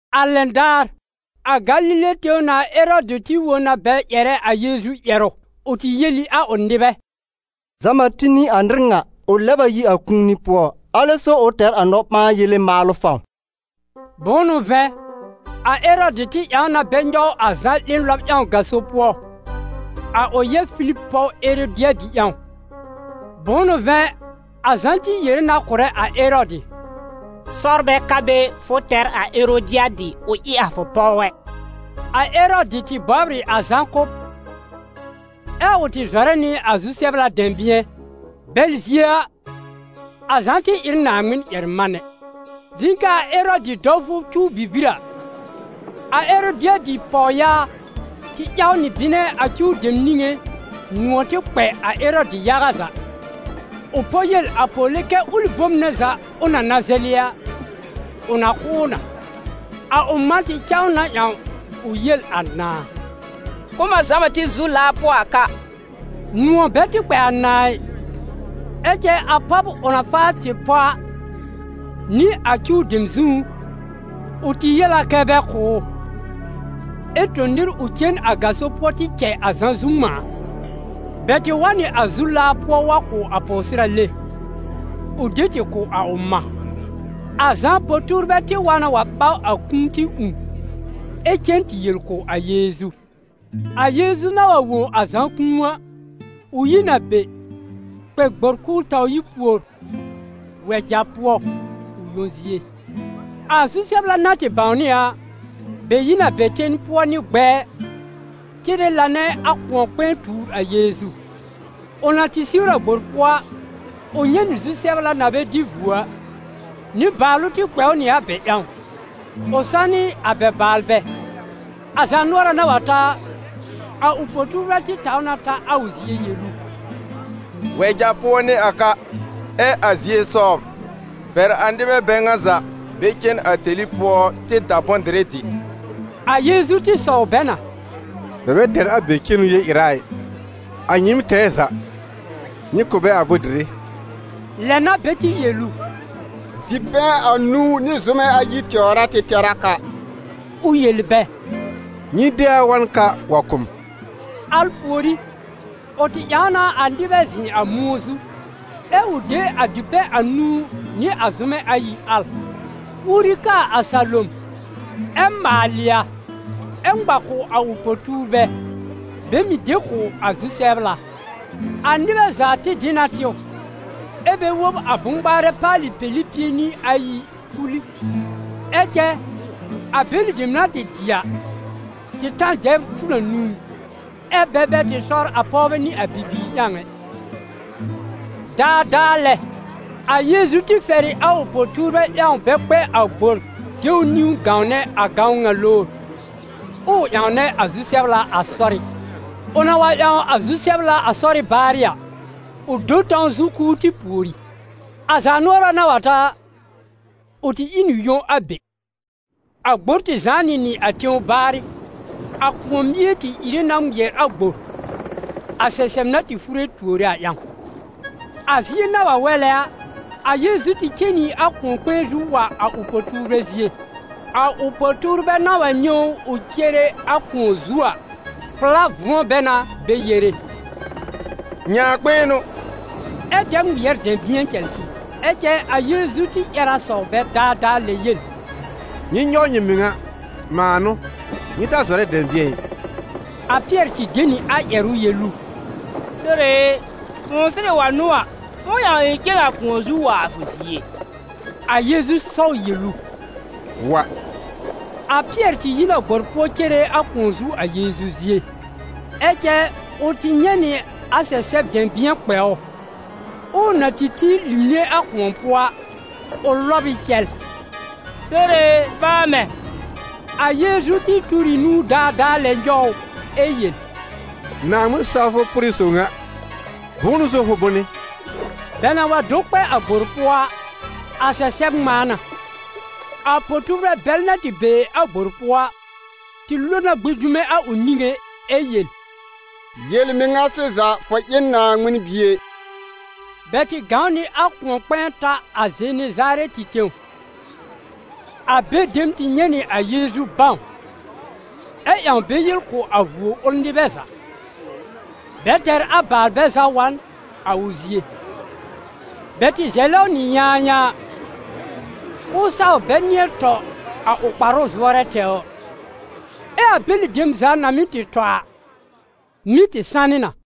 A lɛn daar, a Galile tẽw nãà Erɔdɩ tɩ wõ na bɛ ƴɛrɛ a Yeezu ƴɛrʋ. Ʋ tɩ yel ɩ a ʋ nɩbɛ: «Zã-Bati n'ɩ a nɩr ŋa! Ʋ lɛb a yi a kũuni pʋɔ, alɛ so ʋ tɛr a nɔ-ɓãa-yele maalʋ fãw.» Bʋ̃ʋ n'ʋ vɛ̃, a Erɔdɩ tɩ ƴãw na bɛ nyɔw a Zã 'lẽ lɔb ƴãw gaso pʋɔ, a ʋ yɛb Filib pɔw Erodɩadɩ ƴãw. Bʋ̃ʋ n'ʋ vɛ̃ a Zã tɩ yere na kʋ̀rɛ a Erɔdɩ: «Sɔr bɛ ka be fʋ tɛr a Erodɩadɩ ʋ ɩ a fʋ pɔw ɛ.» A Erɔdɩ tɩ bɔbr ɩ a Zã kʋ́b, ɛ ʋ tɩ zɔrɛ nɩ a zu-sɛbla dɛ̃bɩ̃ɛ, bɛl zie a, a Zã tɩ ɩ n Naaŋmɩn-ƴɛr-manɛ. Zɩ̃ kɛ a Erɔdɩ dɔwfʋ cuw bibir a, a Erodɩadɩ pɔwyaa tɩ ƴaw nɩ bɩnɛ a cuw dem niŋé nʋ̃ɔ̀ tɩ kpɛ a Erɔdɩ yaga za, ʋ pɔ yel a pɔwle kɛ ʋlɩ bom nɛ za ʋ na na zɛlɩ a, ʋ na kʋ̀ ʋ na. A ʋ mã tɩ cã ʋ na ƴãw ʋ yel a nãà: «Kʋ̀ m a Zã-Bati zu laa pʋɔ a ka.» Nʋ̃ɔ̀ bɛ tɩ kpɛ a nãà ɩ, ɛ cɛ a pɔb ʋ na faa tɩ pɔ a, nɩ a cuw dem zũú, ʋ tɩ yel a kɛ bɛ kʋ̀ ʋ, ɛ tõ nɩr ʋ cen a gaso pʋɔ tɩ cɛ a Zã zu ŋmãa. Bɛ tɩ wa n nɩ a zu laa pʋɔ wa kʋ̀ a pɔwsɩrale, ʋ de tɩ kʋ̀ a ʋ mã. A Zã po-tuurbɛ tɩ wa na wa ɓaw a kũu tɩ ũù, ɛ cen tɩ yel kʋ̀ a Yeezu. A Yeezu na wa wõ a Zã kũu a, ʋ yi n a be, kpɛ gbor k'ʋʋ taw yi pùor, wɛja pʋɔ, ʋ yõ zie. A zu-sɛbla na tɩ bãwnɩ a a, bɛ yi n a bɛ ten pʋɔ nɩ gbɛɛ, cere lanɛ a kʋ̃ɔ-kpɛ̃ɛ tuur a Yeezu. Ʋ na tɩ siwr a gbor pʋɔ a, ʋ nyɛ̃ nɩ zu-sɛbla na bɛ dɩ vuo a; nɩbaalʋ tɩ kpɛ ʋ nɩ a bɛ ƴãw, ʋ sanɩ a bɛ baalbɛ. A zaanʋɔra na wa ta a, a ʋ po-tuurbɛ tɩ taw na ta a ʋ zie yel ʋ: «Wɛja pʋɔ n'ɩ a ka, ɛ a zie sɔbr, bɛr a nɩbɛ bɛ ŋa za bɛ cen a tẽli pʋɔ tɩ da bʋ̃-dɩrɩ dɩ.» A Yeezu tɩ sɔw bɛ na: «Bɛ bɛ tɛr a be cenu yel-ɩra ɩ: a nyɩɩm tɛɛ za, nyɩ kʋ̀ bɛ a bʋ̃-dɩrɩ.» Lɛ n'a bɛ tɩ yel ʋ: «Dipɛ̃ anũu nɩ zʋ́mɛ ayi tɛwr a tɩ tɛr a ka.» Ʋ yel bɛ: «Nyɩ de a wa n ka wa kʋ̀ m.» Al pùorí, ʋ tɩ ƴãw na a nɩbɛ zɩ̃ a mʋ̃ɔ zu, ɛ ʋ de a dipɛ̃ anũu nɩ a zʋ́mɛ ayi al, uori kaa a salom, ɛ maalɩ a, ɛ ŋma kʋ̀ a ʋ po-tuurbɛ, bɛ mɩ̀ de kʋ̀ a zu-sɛbla. A nɩbɛ za tɩ dɩ na tɩw, ɛ bɛ wob a bʋ̃-ŋmaarɛ paalɩ peli pie nɩ ayi kul ɩ. Ɛ cɛ a bɛlɩ dem na tɩ dɩ a, tɩ ta n dɛbr tur anũu, ɛ́ bɛ bɛ tɩ sɔr a pɔwbɛ nɩ a bibiir ƴãw ɛ. Daadaa lɛ, a Yeezu tɩ fɛr ɩ a ʋ po-tuurbɛ ƴãw bɛ kpɛ a gbor de ʋ niwn gãwnɛ a gãwn ŋa lowr, ʋʋ ƴãwnɛ a zu-sɛbla a sɔrɩ́. Ʋ na wa ƴãw a zu-sɛbla a sɔrɩ́ baarɩ a, ʋ do n tãw zu k'ʋʋ tɩ pùori. A zaanʋɔra na wa ta a, ʋ tɩ ɩ n ʋ yõ a be. A gbor tɩ zãá nɩ nɩ a tẽw baarɩ; a kʋ̃ɔ mie tɩ ìre na ŋmɩɛr a gbor, a sɛsɛb na tɩ fure tuore a ƴãw. A zie na wa wɛlɛ a, a Yeezu tɩ cen nɩ a kʋ̃ɔ-kpɛ̃ɛ zu wa a ʋ po-tuurbɛ zie. A ʋ po-tuurbɛ na wa nyɛ̃ ʋ ʋ cere a kʋ̃ɔ zu a, pʋ̀lá vʋ̃ɔ bɛ na bɛ yere: «Nyãakpɩɩn n'ʋ!» Ɛ dɛ ŋmɩɛr dɛ̃bɩ̃ɛ cɛlsɩ. Ɛ cɛ a Yeezu tɩ ƴɛr a sɔw bɛ daadaa lɛ yel: «Nyɩ nyɔw nyɩ mɩŋa, mãa n'ʋ, nyɩ ta zɔrɛ dɛ̃bɩ̃ɛ ɩ!» A Pɩɛr tɩ de nɩ a ƴɛrʋ yel ʋ: «Sore e, fʋ̃ʋ sɩrɩ wa n'ʋ a, fʋ̃ʋ ƴãw ɩ̃ cen a kʋ̃ɔ zu wa a fʋ zie.» A Yeezu sɔw yel ʋ: «Wa.» A Pɩɛr tɩ yi n a gbor pʋɔ cere a kʋ̃ɔ zu a Yeezu zie. Ɛ cɛ ʋ tɩ nyɛ̃ nɩ a sɛsɛb dɛ̃bɩ̃ɛ kpɛ ʋ, ʋʋ na tɩ tĩ limne a kʋ̃ɔ pʋɔ a, ʋ lɔb ɩ cɛl: «Sore e, faa mɛ̃!» A Yeezu tɩ tur ɩ nũu daadaa lɛ nyɔw ʋ, ɛ yel: «Naaŋmɩn-sawfʋ pʋrɩ sob ŋa, bʋ̃ʋ n'ʋ so fʋ bʋnɩ?» Bɛ na wa do kpɛ a gbor pʋɔ a, a sɛsɛb ŋmãa na. A po-tuurbɛ bɛl na tɩ be a gbor pʋɔ a, tɩ lo na gbĩ dume a ʋ niŋé ɛ yel: «Yel-mɩŋa sɩza, fʋ ɩ n Naaŋmɩn Bie!» Bɛ tɩ gãw nɩ a kʋ̃ɔ-kpɛ̃ɛ ta a Zenezarɛtɩ tẽw. A be dem tɩ nyɛ̃ nɩ a Yeezu bãw, ɛ ƴãw bɛ yel kʋ̀ a vuo ʋl nɩbɛ za, bɛ tɛr a baalbɛ za wa n a ʋ zie. Bɛ tɩ zɛlɛ ʋ nɩ yãayãa, k'ʋʋ saw bɛ nɩ̃ɛ tɔ a ʋ kparʋ zʋɔrɛ tɛwr, ɛ a bɛlɩ dem za na mɩ́ tɩ tɔ a, mɩ́ tɩ sanɩ na.